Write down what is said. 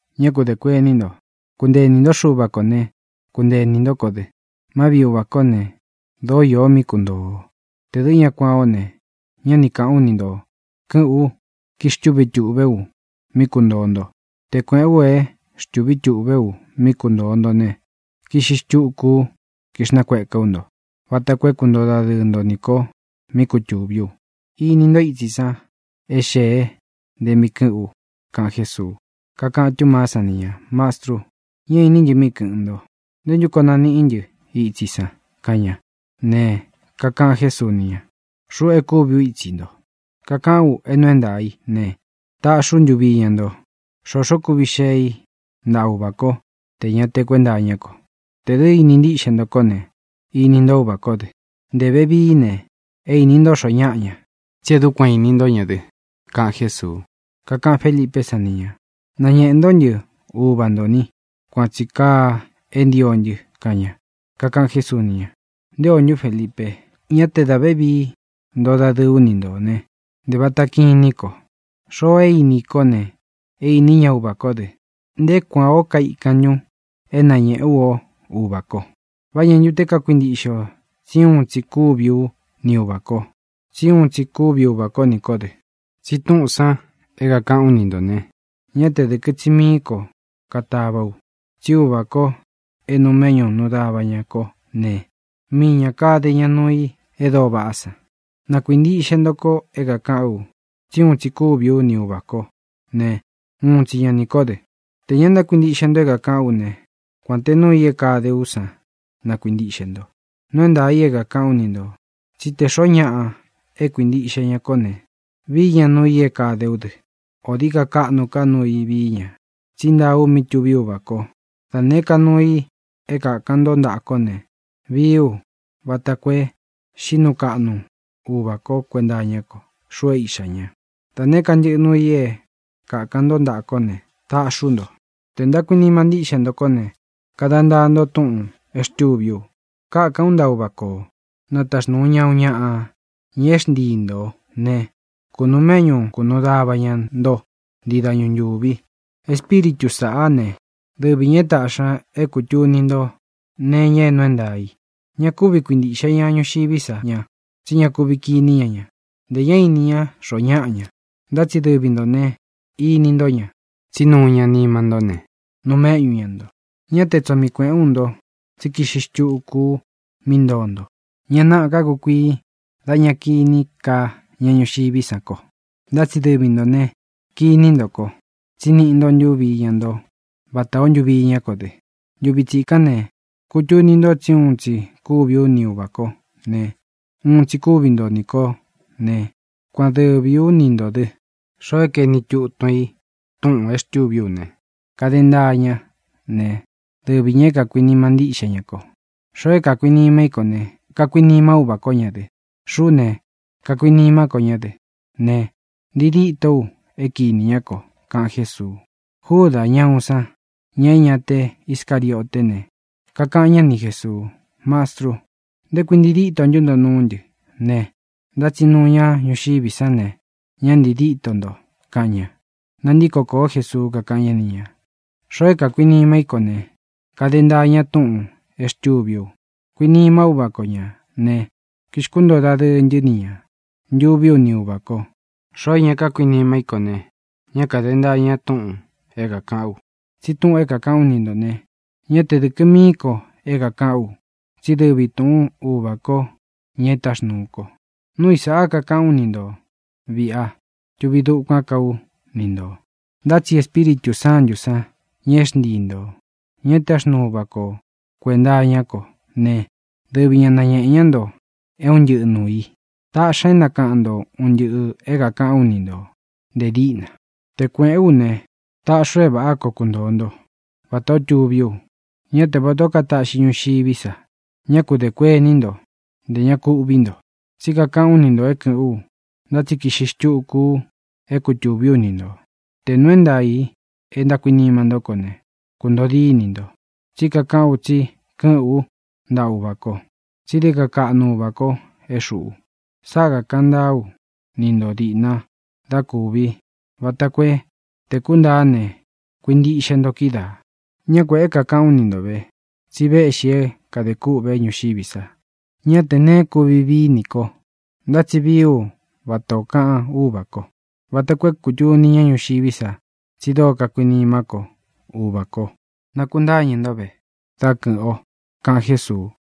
ʼÑá ku dē kuení nto. Kuntee inī ntó Xuva kō né, kuntee inī ntó ko dɨ. Má viꞌi Uvā kó ne, dōó īo mí kuntoo ō. Tē dɨ́ ña kuān ó ne, ñá ni kāꞌán u ni ntō. Kɨ́ꞌɨ̄n ú, kixtúvi tuꞌvé u mí kuntōo nto. Te kuēꞌén u é xtūví tuꞌvé u mí kuntōo nto ne, kiꞌxi xtuku ú, kixnakueká u nto, vata koo é kuntoo dadɨɨ nto nī ko mí kutuví u. Ini ntó itsi san é xēe nte mí kɨ̄ꞌɨ́n u —kaꞌan Jésuu. Kakaꞌan Túmaá san ni ñā: —Mastru, ñá īní ntɨ míꞌi kɨ̄ꞌɨn nto. ¿Ntē ntú koo naníꞌi ntɨ itsi i san? —kaꞌan ña. Ne, kakaꞌan Jésuu ni ña: —Xuꞌu e kúvi u ítsi nto; kakaꞌán u é nuu é ntaā i né, tāꞌxi ú ntuvi iña nto. Xoxó kuvi xee i ntáꞌa Uvā kó tē ña te kuénta iñá ko. Tē dɨ́ ini ntíꞌxe nto kó ne, ini ntó Uvā kó dɨ. Nte vevií ne, é īni ntó xoo ñáꞌa ña, tsi é dukuan īní nto ña dɨ —kaꞌan Jésuu. Kakaꞌan Félipé san ni ñā: —Nañēꞌe ntó ntɨ Uva ntō ni. Kuan tsī kaa é ntio ntɨ —kaꞌan ña. Kakaꞌan Jésuu ni ña: —¿Nté ō ntu, Felipe? Ñá te dā vévii ntoo dadɨɨ ú ni ntō né, ¿ntē vata kinín ko? Xoo e íni i kó ne, é īni ñá Uvā kó dɨ. ¿Nté kuān ó kaikan ntun é nañēꞌé u o Uvā ko? ¿Vá ñā ntu te kákuintiꞌxe o tsi úun tsī kúvi ú ni Uvā ko, tsi úun tsī kúvi Uvā kó nī kó dɨ? Tsi túꞌūn san é kākaꞌán u ni ntō ne, ñá te dɨ̄kɨ tsi mií ko katavá u, tsí Uvā kó e nuu méꞌñu nuu dava ñā kó ne, mii ñā kade ña nuu i e dóo vaꞌá san. Na kuīntiꞌxe nto ko é kākaꞌán u tsi úun tsī kúvi ú ni Uvā kó ne, uun tsi ña nī kó dɨ. Tē ña ntákuintiꞌxe nto é kākaꞌán u ne, kuān te nuu i é kadé u san na kuīntiꞌxe nto. Nuu é ntaā i é kākaꞌán u ni ntō tsí te xōo ñáꞌa é kuintiꞌxe ña kó ne, vií ña nuu i é kadé u dɨ. Ō dií ka kaꞌnu ká nuu i vií ña, tsí ntaa u mí tuvi Úvā ko. Da nēé ka nuu i é kākan ntó ntaꞌa kó ne, vii ú vata koo é xīꞌí nuu kaꞌnu Uvā kó kuenta iñá ko, xuꞌu é Iꞌxā ña. Da nēé ka ntɨꞌɨ nūu i é kākan ntó ntaꞌa kó ne, taꞌxí u nto. ʼTē ntákuinima ntíꞌxe ntō kó ne, kada ntaa nto túꞌūn é xtūví u. Kákān ú ntaꞌa Uvā kó, na taxnūu ña uun ñaꞌa, ña é xntii ntō né, kunuu méꞌñu kunuu dava ña nto ntii dañu ntūvi. Espíritu sāꞌá ne, dɨvi ñā é tāꞌxi ña é kūtuni nto nee iña é nuu é ntaā i. Ña kúvi kuintīꞌxe ña ñuxiví sa ña, tsí ña kuvi kiní ña ña, ntē ñá īni ñá xoo ñáꞌa ña. Ntá tsi dɨvi ntō ne, ini ntó ña, tsí nuu ña nima ntó ne, nuu méꞌñu ña ntō. ʼÑá te tsoo mii kuēꞌén u nto, tsí kiꞌxi xtuku ú mí ntoo nto. Ña náꞌā ká kukuii dā ña kiní ka ña ñuxiví san ko. Ntá tsi dɨvi ntō ne, kiní nto ko. Tsí niꞌi nto ntúvi iña nto vatā ó īó ntuvi iñá ko dɨ. Ntuvi tsikán ne, kutuni nto tsí uun tsi kúvi ú ni Uvā kó ne, uun tsi kúvi nto nī kó ne, kuan dɨvī ú ni ntō dɨ. Xoo é kaeni tutun i túꞌūn é xtûví u ne, kade ntaa ña ne, dɨvi ñā é kākuinima ntíꞌxe ña ko. Xoo é kākuinima í ko ne, kuinima Úvā kó ña dɨ. Xuꞌú ne, kuinimá ko ñá dɨ ne, ntii dîtó u é kīni ñá ko —kaꞌan Jésuu. Júdā, ña uun san, ña é ña te Iscarioté ne, kakaꞌan ñá ni Jēsuu: —Mastru, ¿nté kui ntii díto nto nuú ntɨ ne, ntá tsi nuu ñá ñuxiví san ne, ña ntii díto nto? —kaꞌan ña. Nantíko kōó Jesuu, kakaꞌan ñá ni ñā: —Xoo é kākuinima í ko ne, kade ntaa ña túꞌūn e xtûví u. Kuinima Úvā kó ña ne, kixkuntoo dadɨɨ ntɨ́ ni ña, ntuví u ni Uvā ko. Xoo é ña kákuinima í ko ne, ñá kāde ntaa ña túꞌūn é kākaꞌán u. Tsi túꞌūn é kākaꞌán u ni ntō ne, ñá te dɨ̄kɨ mií ko é kākaꞌán u, tsí dɨvi tūꞌún Uvā ko, ña é táxnūu ko. ʼNúu i sāꞌa kakaꞌán u ni ntō viꞌi a tuvi dukuán ka ú ni ntō. Ntá tsi Espíritū Sántū san, ña é xntii ntō, ña é táxnuu Uvā kó kuenta iñá ko ne, dɨvi ña nañēꞌe ñá nto é un ntɨꞌɨ nuū i. Taꞌxi ña é nakaꞌan nto un ntɨꞌɨ̄ é kākaꞌán u ni ntō nte díꞌna. ʼTe kuēꞌén u ne, taꞌxí u é vāꞌá koo kuntōo nto, vatā ó tuví u, ñá te vatā ó kataꞌxi ña ñuxiví sa. Ñá ku dē kuení nto; ntē ña ku uꞌví nto. Tsí kakaꞌán u ni ntō é kɨ̄ꞌɨ́n u, ntá tsi kiꞌxi xtuku u é kutūví u ni ntō. Te nūu é ntaā i é ntákuinima ntó ko ne, kūntoo dínī nto, tsí kakaꞌán u tsi kɨ́ꞌɨ̄n ú ntaꞌa Uvā ko. Tsí dií ka kaꞌnu Uvā ko é xuꞌu. Sáꞌa kākaꞌan ntáa ú ni ntō diꞌna dá kūvi vata koo é, tē kúntāá ne, kuintiꞌxe nto kídaā. ʼÑá kuēꞌé ka kaꞌán u ni nto vē, tsi véꞌxī é kadē kûꞌve ñuxiví sa. Ñá tē neé kuvi vií nī ko, ntá tsi vií u vata ō kaꞌan Úvā kó, vata koo é kūtuni ñá ñuxiví sa tsi dóo kakuinimá ko Uvā ko. Nakuntáñɨ̄ ntó ve, dá kɨ̄ꞌɨn o —kaꞌan Jésuu.